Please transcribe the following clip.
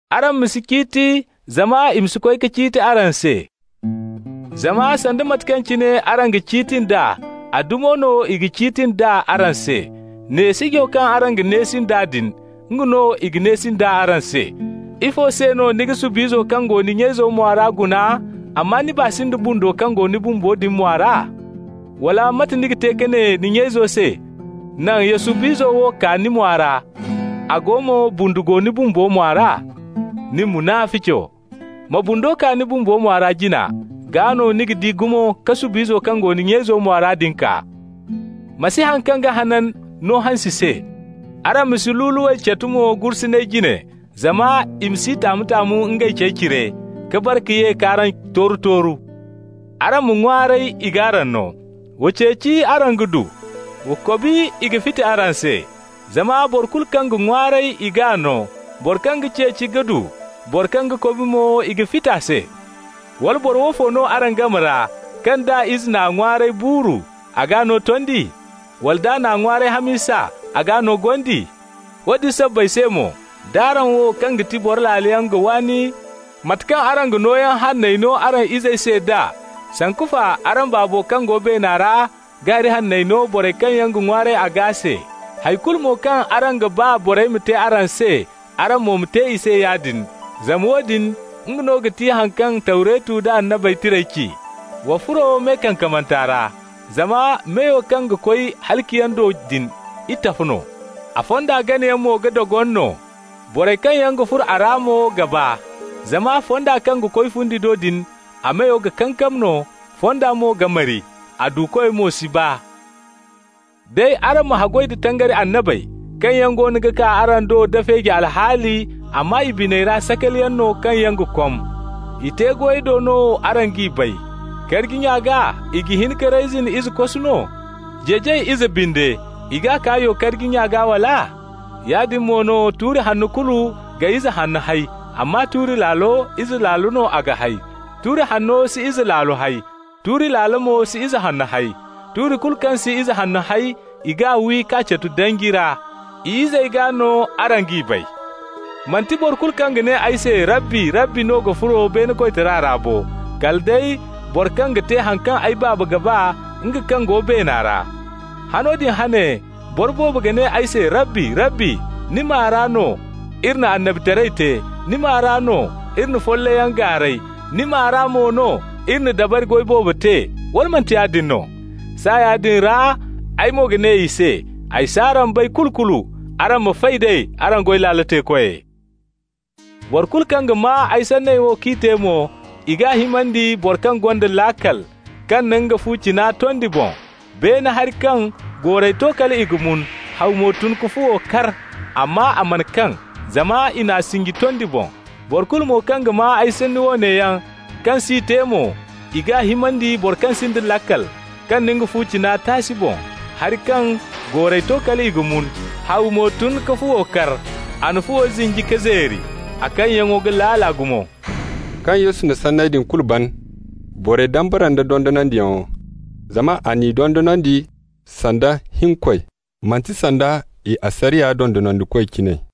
Araŋ ma si ciiti, zama i ma si koy ka ciiti araŋ se. Zama sanda mate kaŋ cine araŋ ga ciiti nd'a, a dumi no i ga ciiti nd'a araŋ se. Neesijo kaŋ araŋ ga neesi nd'a din, nga no i ga neesi nd'a araŋ se. Ifo se no ni ga sub'izo kaŋ go ni nya-izo mwa ra guna, amma ni baa si nda bundo kaŋ go ni bumbo din mwa ra? Wala mate ni ga te ka ne ni nya-ize se: ‹Naŋ ya sub'izo wo kaa ni mwa ra,› a go mo bundu go ni bumbo mwa ra? Nin, munafico! ma bundo kaa ni bumbo mwa ra jina, gaa no ni ga di gumo ka sub'izo kaŋ go ni nya-izo mwa ra din kaa. Ma si haŋ kaŋ ga hanan no hansi se. Araŋ ma si luluwey catu mo gursuney jine, zama i ma s'i taamu-taamu ngey cey cire, ka bare ka ye k'araŋ tooru-tooru. Araŋ ma ŋwaaray, i g'araŋ no. Wa ceeci, araŋ ga du. Wa kobi, i ga fiti araŋ se. Zama boro kulu kaŋ ga ŋwaaray, i g'a no, boro kaŋ ga ceeci ga du, boro kaŋ ga kobi mo, i ga fiti a se. Wala boro woofo no araŋ game ra, kaŋ d'a ize n'a ŋwaaray buuru, a g'a no tondi? Wala d'a n'a ŋwaaray hamisa, a g'a no gondi? Woodin sabbay se mo, d'araŋ wo, kaŋ ga ti boro laaloyaŋ ga waani mate kaŋ araŋ ga nooyaŋ hanney no araŋ izey se nd'a, sanku fa araŋ Baabo kaŋ go beena ra ga hari hanney no borey kaŋ yaŋ ga ŋwaaray a gaa se. Hay kulu mo kaŋ araŋ ga ba borey ma te araŋ se, araŋ mo ma te i se yaadin, zama woodin, nga no ga ti haŋ kaŋ Tawretu da Annabey Tirey ci. Wa furo me kankamanta ra. Zama meyo kaŋ ga koy halaciyaŋ do din, itafo no, a fonda ganayaŋ mo ga dogon no, borey kaŋ yaŋ ga furo a ra mo ga baa. Zama fonda kaŋ ga koy fundi do din, a meyo ga kankam no, fonda mo ga mari, a duukoy mo si baa. Day araŋ ma haggoy da tangari annabey, kaŋ yaŋ goono ga kaa araŋ do da feeji alhaali, amma i biney ra sakaliyaŋ no kaŋ yaŋ ga kom. I te-goyey do no araŋ g'i bay. Karji nya gaa i ga hin ka reyzin ize kosu no? Jeejay ize binde, i g'a kaa yo-karji nya gaa, wala? Yaadin mo no, tuuri hanno kulu ga ize hanno hay, amma tuuri laalo, ize laalo no a ga hay. Tuuri hanno si ize laalo hay. Tuuri laalo mo si ize hanno hay. Tuuri kulu kaŋ si ize hanno hay, i g'a wi k'a catu danji ra. I izey gaa no araŋ g'i bay. Manti boro kulu kaŋ ga ne ay se: ‹Rabbi! Rabbi!› no ga furo beene koytara ra bo, kala day boro kaŋ ga te haŋ kaŋ ay Baaba ga ba, nga kaŋ go beena ra. Hano din hane boro boobo ga ne ay se: ‹Rabbi, Rabbi! Ni maa ra no iri na annabitaray te. Ni maa ra no iri na follayyaŋ gaaray, ni maa ra mo no iri na dabari goy boobo te. Wala manti yaadin no?› Saaya din ra ay mo ga ne i se: ‹Ay s'araŋ bay kulu-kulu! Araŋ ma fay d'ay, araŋ goy laalo teekoy.› Boro kulu kaŋ ga maa ay sanney wo k'i te mo, i g'a himandi boro kaŋ gonda laakal, kaŋ na nga fu cina tondi boŋ. Beene hari kaŋ, goorey to kal i ga mun, haw mo tun ka fuwo kar. Amma a mana kaŋ, zama i n'a sinji tondi boŋ. Boro kulu mo kaŋ ga maa ay sanni woone yaŋ kaŋ s'i te mo, i g'a himandi boro kaŋ sinda laakal, kaŋ na nga fu cina taasi boŋ. Hari kaŋ, goorey to kal i ga mun, haw mo tun ka fuwo kar. A na fuwo zinji k'a zeeri. A kaŋyaŋo ga laala gumo.» Kaŋ Yesu na sanney din kulu ban, borey dambara nd'a dondonandiyaŋo, zama a n'i dondonandi sanda hinkoy, manti sanda i asariya dondonandikoy cine.